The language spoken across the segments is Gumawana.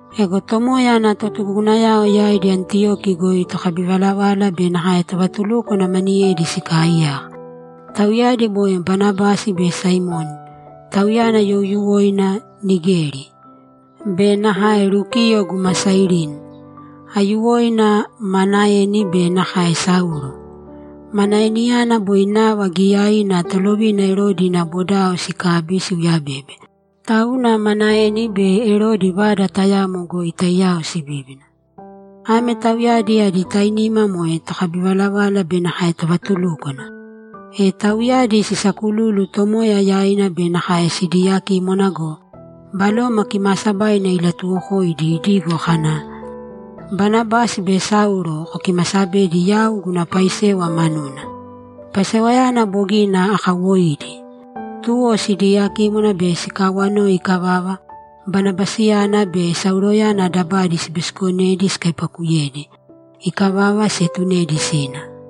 Ego Tomoya ana totugugunayao yaidi Antiyoki goi tokabivalavala be nakae tovatulúkwana maniyedi sikaaiyaka. Tauyadi moe Banabasi be Simioni (tauyana youyuwoina Nigeri), be nakae Lukiyo guma Sairini. Aiyuwoina Manaeni be nakae Saulo. Manaeniyana boi nava giiyaina Tolovina Erodi ina bodao sikabi, siuyabebe, tauna Manaeni be Erodi vada tayamo goi taiyao sibíbina. Ame tauyadi adi tainima moe tokabivalavala be nakae tovatulúkwana. E tauyadi sisaakululu Tomoya yaina be nakae sidiiyakímwana go, Baloma Kimaasabaina ilatuwokoidi idigo kana, ‘Banabasi be Saulo kokimasabedi yau guna paisewa manuna; paisewayana bogina akawoidi.’ Tuwo sidiyakímwana be sikawanoi ikavava, Banabasiyana be Sauloyana dabadi sibisikonedi sikaipakuyedi. Ikavava, sietunedi sina.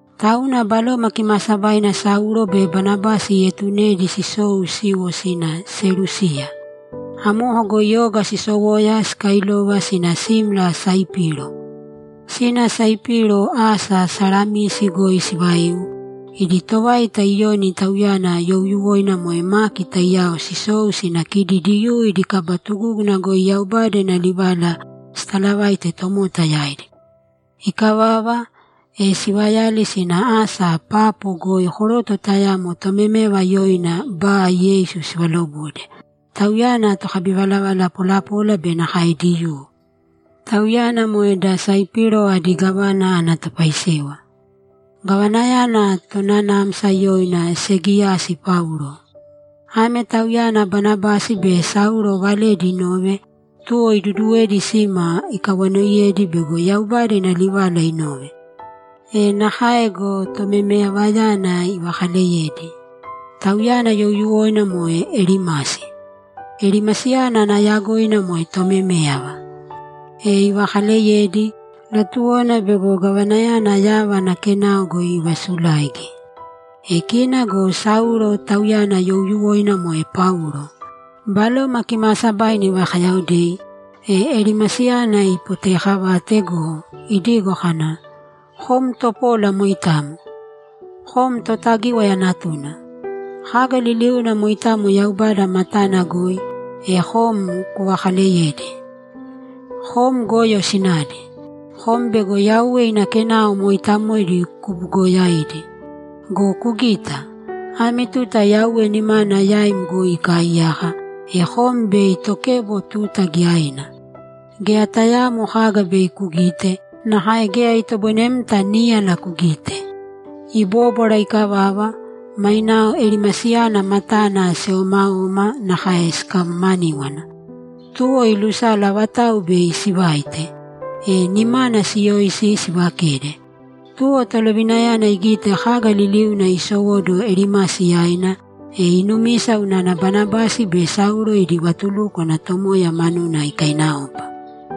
Tauna Baloma Kimaasabaina Saulo be Banabasi ietunedi sisou siiwo sina Selúsiya. Amoko goi oga sisowoya sikailova sina simla Saipiro. Sina Saipiro, asa Salamisi goi sivaiu, idi tovaita Iyoni (tauyana youyuwoina moe Maki) taiyao sisou sina kidi Diyuu idi kaba tugúguna goi Yaubada ina livala sitaalavaite tomota yaidi. Ikavava, e sivayali sina asa Papo goi koroto tayamo tomeméyava yoina Ba-Yeisu sivalobode; tauyana tokabivalavala polapola be nakae Diyuu. Tauyana moe da Saipiro adi gávana ana topaisewa. Gavanayana tonanamsa yoina Segiyasi Paulo. Ame tauyana Banabasi be Saulo valedi inove, tuwo iduduwedi sima ikawanoiyedi bego Yaubada ina livala inove. E nakae go, tomemeyavayana ivakaaleyedi. Tauyana youyuwoina moe Elimasi. Elimasiyana ana yagoina moe tomeméyava. E ivakaaleyedi; latuwona bego gavanayana yava ana kenao goi ivasulaigi. E kina go Saulo, tauyana youyuwoina moe Paulo, Baloma Kimaasabaina ivakayaodei, e Elimasiyana ipoteekavate go, idigo kana, ‘Kom topola moitamo. Kom Totagíwaya natuna. Kaga liliuna moitamo Yaubada matana goi, e kom kuvakaleyedi. Kom goyo sinadi. Kom bego Yauwe ina kenao mooitamoidi kubuugoyaidi! Go kugīta! Ame tuta Yauwe nimana yaim goi ikaaiyaka, e kom bei tokebo tuta giyaina. Geya tayaamo kaga bei kugite, nakae geya itoboinemta níyala kugite.’ Ibobóbwara ikavava, mainao Elimasiyana matana siomaoma nakae sikamamaníwana. Tuwo ilusala avatauwa bei sivaite, e nimana siyoisi sivakede. Tuwo tolovinayana igite kaga liliuna isowóduwo Elimasi yaina, e inumisa unana Banabasi be Saulo idi vatulúkwana Tomoya manuna ikainaopa.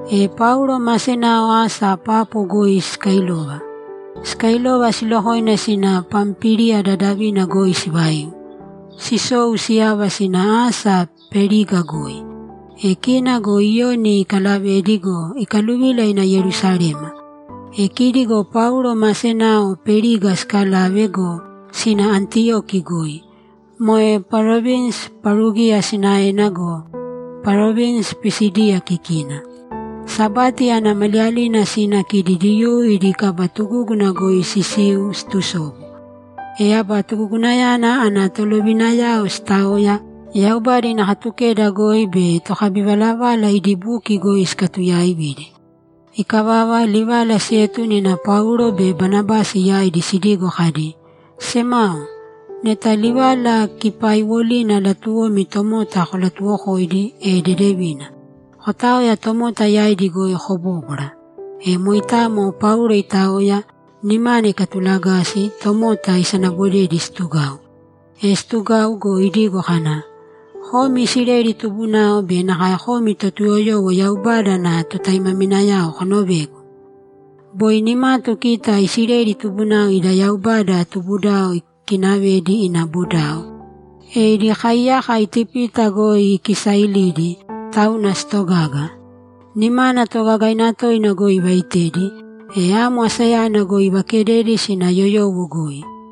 E Paulo ma senao asa Papo goi sikailova. Sikailova, silokoina sina Pampíliya dadavina goi sivaiu, sisou siyava sina asa Periga goi. E kina go Iyoni ikalavedi go, ikaluvila ina Yerusalema. E kidi go Paulo ma senao Periga sikalave go, sina Antiyoki goi, moe parovinsi Parugiya sinaena go, parovinsi Pisídiya kikina. Sabati ana maliyalina sina kidi Diyuu idi kaba tugúguna goi sisiu situsobu. E aba tugugunayana ana tolovinayao sitaoya, Yaubada ina Katukeda goi be tokabivalavala idi buki goi sikatuyaividi. Ikavava, livala sietune ina Paulo be Banabasi yaidi sidigo kadi, ‘Semao, neta livala kipaaiwolina latuwomi tomota kolatuwokoidi, e dedevina; kotaoya tomota yaidi goi kobóbwara.’ E moitamo Paulo itaoya, nimana ikatulagasi, tomota isanabodedi situgau. E situgau go, idigo kana, ‘Komi Isileli tubunao be nakae komi Totuyoyowo Yaubada ana totaimaminayao konovēgu. Boi nimatu kita Isileli tubunao ida Yaubada tubudao ikinavedi ina bodao, e idi kaiyaka Itipita goi ikisailidi, tauna sitogaga. Nimana toogagaina toina goi ivaitedi, e amo asayana goi ivakededi sina yoyowo goi.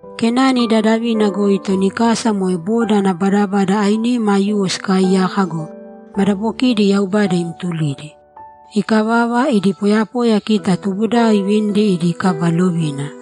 Kenani dadavina goi toni kasa moe boda ana badabada ainima aiyuwo sikaaiyaka go, madabokidi Yaubada imtulidi. Ikavava, idi poyapoyayana kita tubudao ivinidi idi kaba lovina.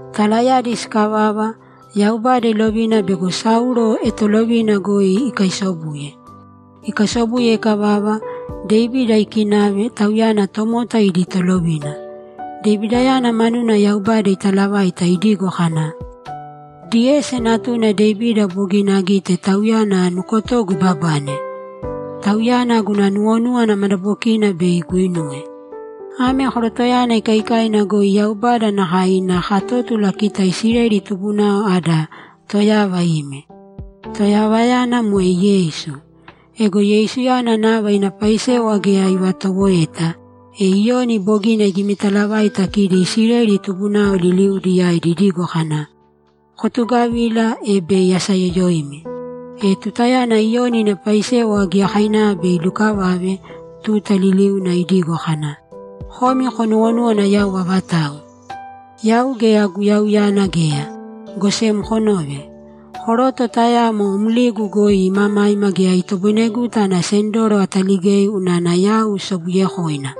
Talayadi sikavava, Yaubada ilovina bego Saulo etolovina goi ikaisobuye. Ikaisobuye ikavava, Devida ikinave, tauyana tomota idi tolovina. Devidayana manuna Yaubada italavaita idigo kana, “Diyesi natuna Devida bogina agite tauyana nukotogu ibabane. Tauyana guna nuwonúwana madabokina bei iguinuwe.” Ame korotoyana ikaikaina goi Yaubada nakae ina katótula kita Isileli tubunao ada Toyava ime. Toyavayana moe Yeisu. Ego Yeisuyana nava ina paisewa geya ivatowoeta, e Iyoni bogina igimitalavaita kidi Isileli tubunao liliudi yaidi idigo kana, “Kotugavīla, e bei asayoyoimi.” E tutayana Iyoni ina paisewa giyakainava bei ilukavave, tuta liliuna idigo kana, “Komi konuwonúwana yau avatau? Yau geya Guyauyana geya, go sem konōve; koroto tayamo mligu goi imamaima geya itoboineguta ana sendoro ataligei unana yau sobuyekoina.”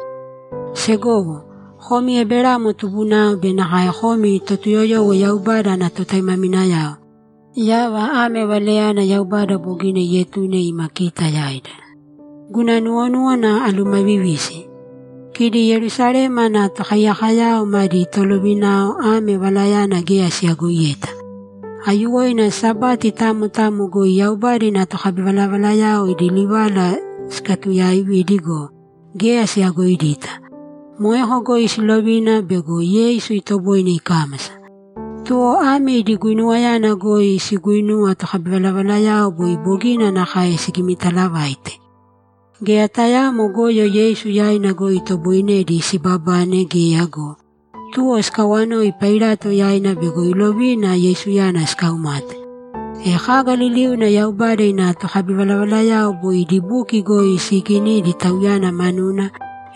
Segowo, komi Eberamo tubunao be nakae komi Totuyoyowo Yaubada ana totaimaminayao, yava ame valenayana Yaubada bogina ietune ima kita yaida. Guna nuwonúwana alumavivisi. Kidi Yerusalema ana tokaiyakoyao madi tolovinao ame valayana geya siyagoiyeta. Aiyuwoina Sabati tamo tamo goi Yaubada ina tokabivalavalayao idi livala sikatuyaaividi go, geya siyagoidita. Moeko goi silovina bego Yeisu itoboine ikámasa. Tuwo ame idi guinuwayana goi siguinuwa tokabivalavalayao boi bogina nakae sigimitalavaite. Geya tayaamo goyo Yeisu yaina goi itoboinedi sibabane geya go, tuwo sikawanoi Pailato yaina bego ilovina Yeisuyana sikaumate. E kaga liliuna Yaubada ina tokabivalavalayao boi idi buki goi siiginidi Tauyana manuna,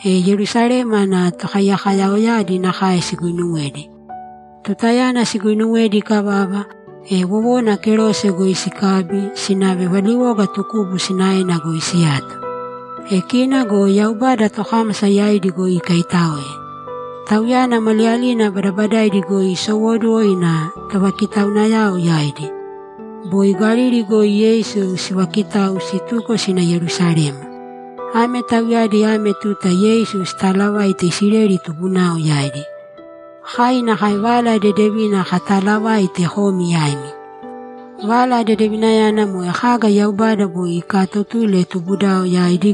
e Yerusalema ana tokaiyakoyaoyadi nakae siguinuwedi. Tutayana siguinuwedi ikavava, e wowona kerose goi sikabi, sinave valiwoga tukubu sinaena goi siyato. E kina go Yaubada tokámasa yaidi goi ikaitáoe. Tauyana maliyalina badabadaidi goi isowóduwo ina tovakitaunayao yaidi. Boi Galili goi Yeisu sivakitau situko sina Yerusalema. Ame tauyadi ame tuta Yeisu sitaalavaite Isileli tubunao yaidi. Kai nakae Vala Dedevina kataalavaite komi yaimi. Vala Dedevinayana moe kaga Yaubada boi ikaatotuli tubudao yaidi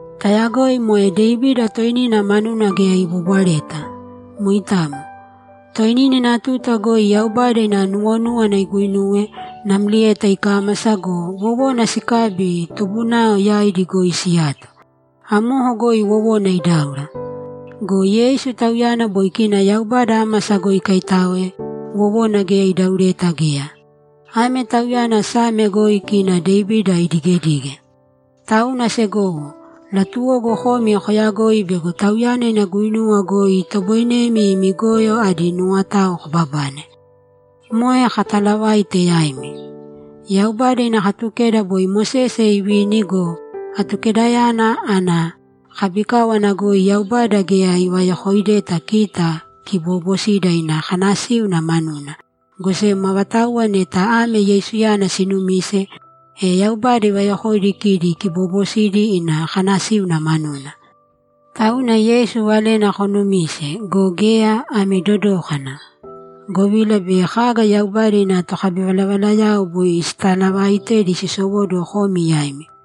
Tayagoi moe Devida toinina manuna geya ibobwareta. Moitamo. Toinina ina tuta goi Yaubada ina nuwonúwana iguinuwe, namlieta ikámasa go, wowona sikabi tubunao yaidi goi siyato. Amoko goi wowona idáura. Go Yeisu, Tauyana boi kina Yaubada ámasa goi ikaitáoe, wowona geya idaureta geya. Ame Tauyana Same goi kina Devida idigedige. Tauna segowo, latuwogu komi koyagoi bego Tauyana ina guinuwa goi itoboinemi imi goyo adi nuwotao kobabane. Moe kataalavaite yaimi. Yaubada ina Katukeda boi Mosese ivini go, Atukedayana ana kabikáwana goi Yaubada geya ivayokoideta kita kiboobosidi ina kanasíuna manuna, go sem avatauwa neta ame Yeisuyana sinumise, e Yaubada ivayokoidi kidi kiboobosidi ina kanasíuna manuna. Tauna, Yeisu valena konumīse go, geya, ami dodōkana, govila bei kaga Yaubada ina tokabivalavalayao boi sitalavaaitedi sisowóduwo komi yaimi.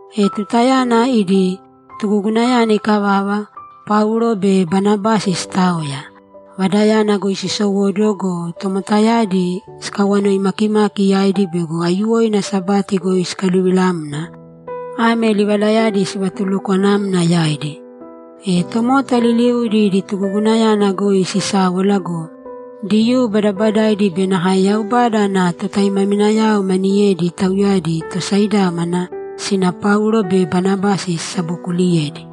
E tutayana idi tugugunayana ikavava, Paulo be Banabasi sitaoya, vadayana goi sisowóduwo go, tomotayadi sikawanoi makimaki yaidi bego aiyuwoina Sabati goi sikaluvilamna, ame livalayadi sivatulukwanamna yaidi. E tomota liliudi idi tugugunayana goi sisáwala go, Diyuu badabadaidi be nakae Yaubada ana totaimaminayao maniyedi, tauyadi tosaidámana, sina Paulo be Banabasi sisabokuliyedi.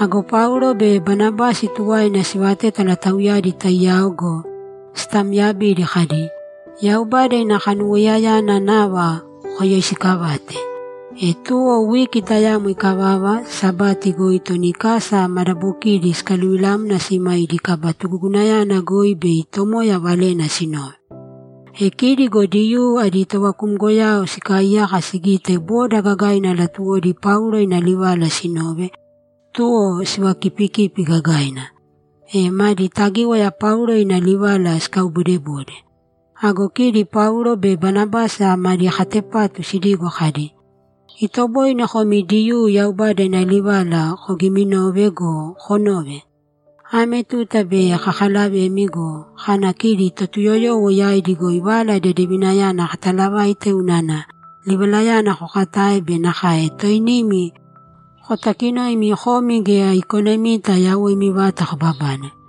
Ago Paulo be Banabasi tuwaina sivatétala tauyadi taiyao go, sitaamyabidi kadi, ‘Yaubada ina kanuwoiyayana nava koyoisiikavāte.’ E tuwo wiki tayamo ikavava, Sabati goi toni kasa madabokiidi sikaluvilamna sima idi kaba tugugunayana goi bei Tomoya valena sinove. E kidi go Diyuu adi tovakumgoyao sikaaiyaka sigite boda gagaina latuwodi Paulo ina livala sinove, tuwo sivakiipikipi gagaina, e madi tagíwaya Paulo ina livala sikauboodebode. Ago kidi Paulo be Banabasi madi katepatu sidigo kadi, ‘Itoboine komi Diyuu Yaubada ina livala kogiminove go, konōve! Ame tuta bei kakalavemi go, kana kidi Totuyoyowo yaidi goi Vala Dedevinayana katalavaite unana livalayana kokatae be nakae toinimi kotakinoimi komi geya ikonemita yawoimi vata kobabane.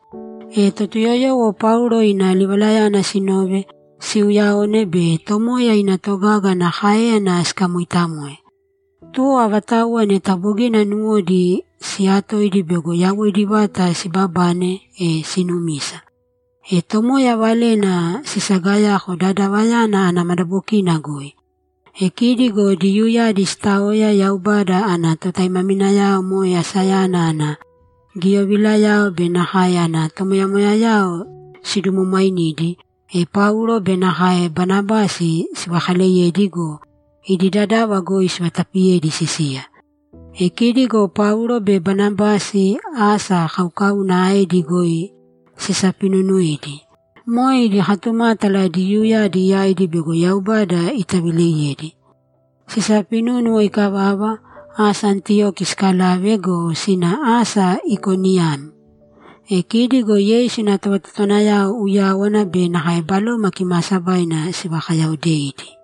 E Totuyoyowo Paulo ina livalayana sinove, siuuyaone be Tomoya ina togaga ana káeyana sikamooitamoe. Tuwo avatauwa neta bogina nuwodi siyatoidi bego yawoidi vata siibabane, e sinumisa. E Tomoya valena sisagayako dadavayana ana madabokina goi. E kidi go Diyuuyadi sitaoya Yaubada ana totaimaminayao moe asayana ana giyovilao be nakae ana tomoyamoyayao sidumwamwainidi, e Paulo be nakae Banabasi sivakaleyedi go, idi dadava goi sivatapiyedi sisiya. E kidi go Paulo be Banabasi asa kaukauna aedi goi sisapinunuidi. Moe idi katumátala Diyuuyadi yaidi bego Yaubada itavileiyedi. Sisapinúnuwo ikavava, asa Antiyoki sikalave go, sina asa Ikoniyam. E kidi go Yeisu ina tovatotowanayao uyáwana be nakae Baloma Kimaasabaina sivakayaaodeidi.